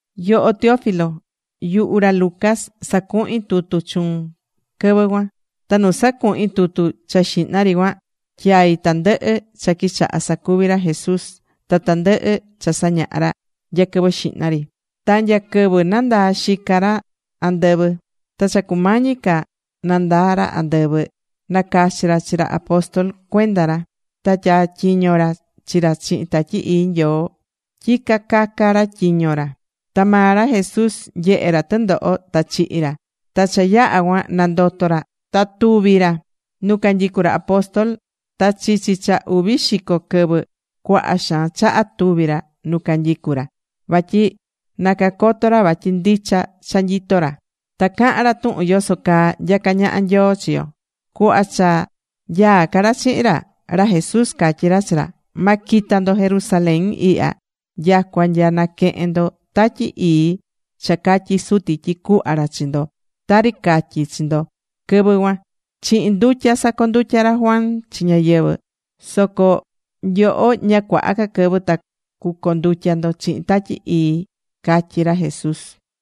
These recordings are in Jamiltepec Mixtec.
Yoho Teófilo, yuhu ra Lucas sacuhi̱n tutu chuun quɨvɨ cuan. Ta nu sacuhín tutu cha xihna ri cuan, tyai̱ tandɨhɨ cha quichaha̱ sacuvi ra Jesús ta tandɨhɨ cha sañaha̱ ra nya quɨvɨ xihna ri ta nya quɨvɨ nandaa̱ xica ra andɨvɨ. Ta cha cumañi ca nandaa ra andɨvɨ, nacachi̱ ra chi ra apóstol cuenda ra. Ta tyatyiño̱ ra chi ra chihin Tatyi Ii Nyoo tyi cacaca ra tyiño ra. Ta maa ra Jesús nyehe̱ ra tɨndoho ta chihi̱ ra. Ta cha yaha̱ cuan, nandoto̱ ra ta tuvi̱ ra nu canyicú ra apóstol. Ta chichi cha uvi xico quɨvɨ, cuaha xaan chaha tuvi̱ ra nu canyicú ra, vatyi na cacoto ra vatyi ndicha cha nyitó ra. Ta caha̱n ra tuhun yoso caa nyacá ñaha Nyoo chi yo. Cuhva cha nyaá ca ra chihin ra, ra Jesús catyí ra chi ra: ―Ma quita ndo Jerusalén ihya, nyacua nya naquehen ndo Tatyi Ii cha catyi̱ Suti tyi cuhva ra chi ndo, tari catyi̱ chi ndo quɨvɨ cuan. Chihin ndutya sacondutya̱ ra Juan chi ñáyɨvɨ. Soco nyoho ña cuaha ca quɨvɨ ta cucondutya ndo chihin Tatyi Ii ―catyí ra Jesús.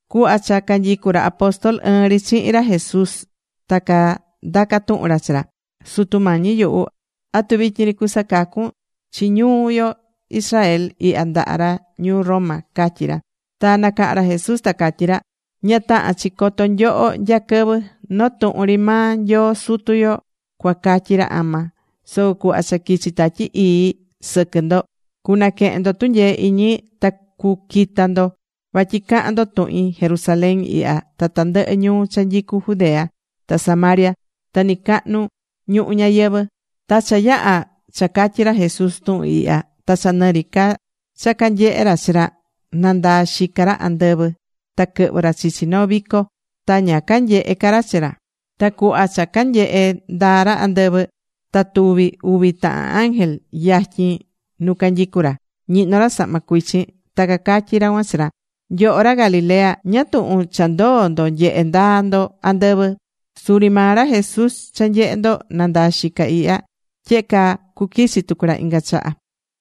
Cuhva cha canyicú ra apóstol ɨɨn ri chihin ra Jesús, ta candaca̱ tuhun ra chi ra: ―Sutu Mañi yuhu, ¿atu vityin ri cusacacun chi ñuu yo Israel ihya ndaha ra ñuu Roma? ―catyí ra. Ta nacaha̱n ra Jesús ta catyí ra: ―Ña tahán chi coto nyoho nya quɨvɨ. Noo tuhun ri maa Nyoo Sutu yo cuacatyi ra ama. Soco cuhva cha quichi Tatyi Ii sɨquɨ ndo cunaquehen ndo tunyee iñi, ta cuquita ndo vatyi cahan ndo tuhin Jerusalén ihya ta tandɨhɨ ñuu cha nyicú Judea ta Samaria, ta nɨcahnu ñuhu ñayɨvɨ̱. Ta cha yaha̱ cha catyi̱ ra Jesús tuhun ihya, ta cha nɨ ri ca cha canyehé ra chi ra, nandaa̱ xica ra andɨvɨ, ta quɨhvɨ̱ ra chichi noo vico. Ta ña canyehe̱ ca ra chi ra. Ta cuhva cha canyehé ndaa ra andɨvɨ, ta tuvi̱ uvi tahan ángel yatyin nu canyicú ra. Ñihnó ra sahma cuichin. Ta cacatyí ra cuan chi ra: ―Nyoho ra Galilea, ¿ñáá tuhun cha ndoo̱ ndo nyehé ndaa ndo andɨvɨ? Suri maa ra Jesús cha nyehe̱ ndo nandaa̱ xica ihya, tyehe caa cuquichi tucu ra inga chaha.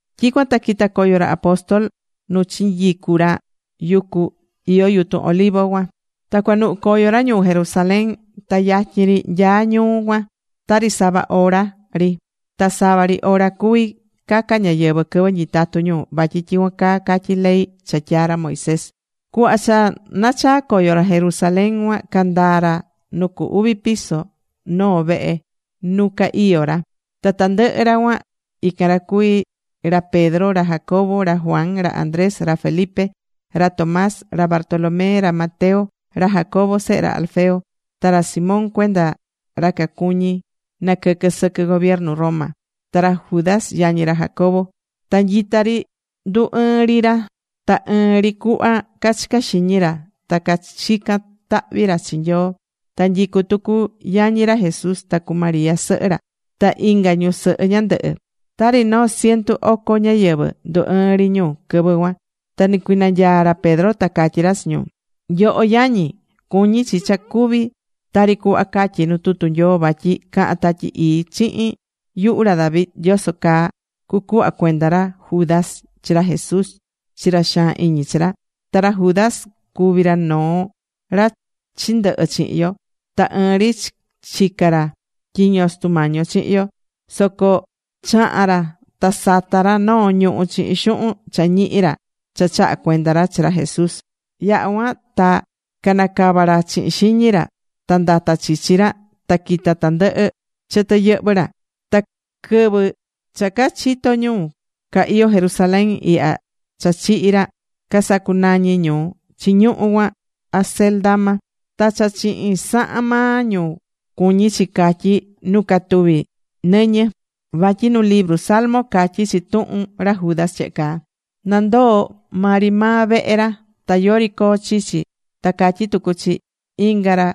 Tyicuan ta quita̱ coyo ra apóstol nu chinyicu̱ ra yucu nu iyó yutun olivo cuan. Ta cuanuhú coyo ra ñuu Jerusalén. Ta yatyin ri nyaá ñuu cuan, tari sava hora ri. Ta sava ri hora cuví caca ñáyɨvɨ quɨvɨ nyitatú ñu, vatyi tyicuan caa catyí ley cha tyaa̱ ra Moisés. Cuhva cha nachaa̱ coyo ra Jerusalén cuan, candaa̱ ra nu cu uvi piso noo vehe nu ca iyó ra. Ta tandɨhɨ ra cuan, ican ra cuví, ra Pedro, ra Jacobo, ra Juan, ra Andrés, ra Felipe, ra Tomás, ra Bartolomé, ra Mateo, ra Jacobo sehe ra Alfeo, ta ra Simón cuenda ra cacuñí naquɨquɨ sɨquɨ gobiernu Roma, ta ra Judas yañi ra Jacobo. Ta nyita ri ndu ɨɨ́n ri ra ta ɨɨn ri cuhva cachicá xiñi ra ta cachicán tahvi ra chi Nyoo. Ta nyicú tucu yañi ra Jesús ta cu María sɨhɨ ra, ta inga ñusɨhɨ ñandɨhɨ. Tari noo ciento oco ñáyɨvɨ ndu ɨɨ́n ri ñu quɨvɨ cuan. Ta nicuinanyaa̱ ra Pedro. Ta catyí ra chi ñu: ―Nyoho yañi, cuñi̱ chi cha cuvi̱ tari cuhva catyí nu tutu Nyoo. Vatyi caha̱n Tatyi Ii chihin yuhu ra David yoso caa cucuhva cuenda ra Judas chi ra Jesús chi ra xaan iñi chi ra. Ta ra Judas cuvi̱ ra noo ra chindɨhɨ̱ chihin yo. Ta ɨɨn ri chica̱ ra tyiño Sutu Mañi yo chihin yo. Soco chaha̱n ra, ta sata̱ ra noo ñuhú chihin xuhun cha ñihi̱ ra cha chaha̱ cuenda ra chi ra Jesús. Yaha̱ cuan ta canacava̱ ra chihin xiñi ra, ta ndata̱ chichi ra ta quita̱ tandɨhɨ chɨtɨ yɨhvɨ ra. Ta quɨvɨ cha cachito̱ ñu ca iyó Jerusalén ihya cha chihi̱ ra, casacunañi̱ ñu chi ñuhu cuan Acéldama. Ta cha chihin sahan maa ñu cuñí chi catyí Nu Catuvi Nɨñɨ. Vatyi nu libru Salmo catyí chi tuhun ra Judas tyehe caa: Na ndoo maa ri maa vehe ra. Ta yori coo chichi. Ta catyí tucu chi: Inga ra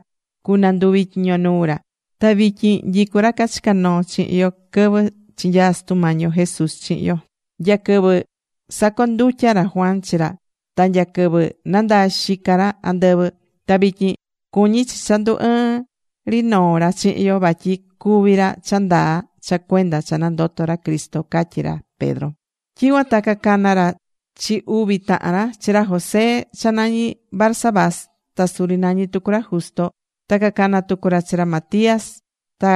cunanduvi tyiño nuu ra. ’Ta vityin nyicú ra cachica̱ noo chihin yo quɨvɨ chinyaa̱ Sutu Mañi yo Jesús chihin yo; nya quɨvɨ sacondutya̱ ra Juan chi ra, ta nya quɨvɨ nandaa̱ xica ra andɨvɨ. Ta vityin cuñí chi cha ndu ɨɨn ri noo ra chihin yo, vatyi cuvi ra cha ndaa cha cuenda cha nandoto̱ ra Cristo ―catyí ra Pedro. Tyicuan ta cacana̱ ra chi uvi tahan ra, chi ra José cha nañi Barsabás, ta suri nañí tucu ra Justo; ta cacana̱ tucu ra chi ra Matías. Ta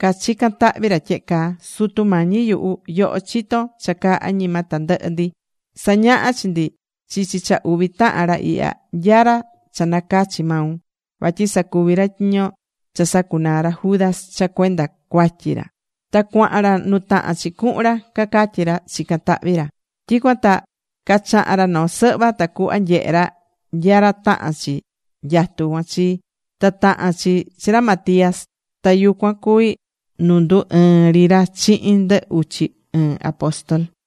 cachica̱n tahvi ra tyehe caa: ―Sutu Mañi yuhu, yoho chitón cha caa añima tandɨhɨ ndi. Sa̱ñaha chi ndi chichi cha uvi tahan ra ihya, nya ra cha nacachi̱ maun, vatyi sacuvi ra tyiño cha sacunaa̱ ra Judas cha cuenda cuatyi ra, ta cuaha̱n ra nu tahán chi cuhun ra ―cacatyí ra, chicán tahvi ra. Tyicuan ta cachaha̱n ra noo sɨhva, tacuhva nyehe ra nya ra tahán chi nyatu cuan chi. Ta taha̱n chi chi ra Matías. Ta yucuan cuví nu ndu ɨɨ̱n ri ra chihin ndɨ uchi ɨɨn apóstol.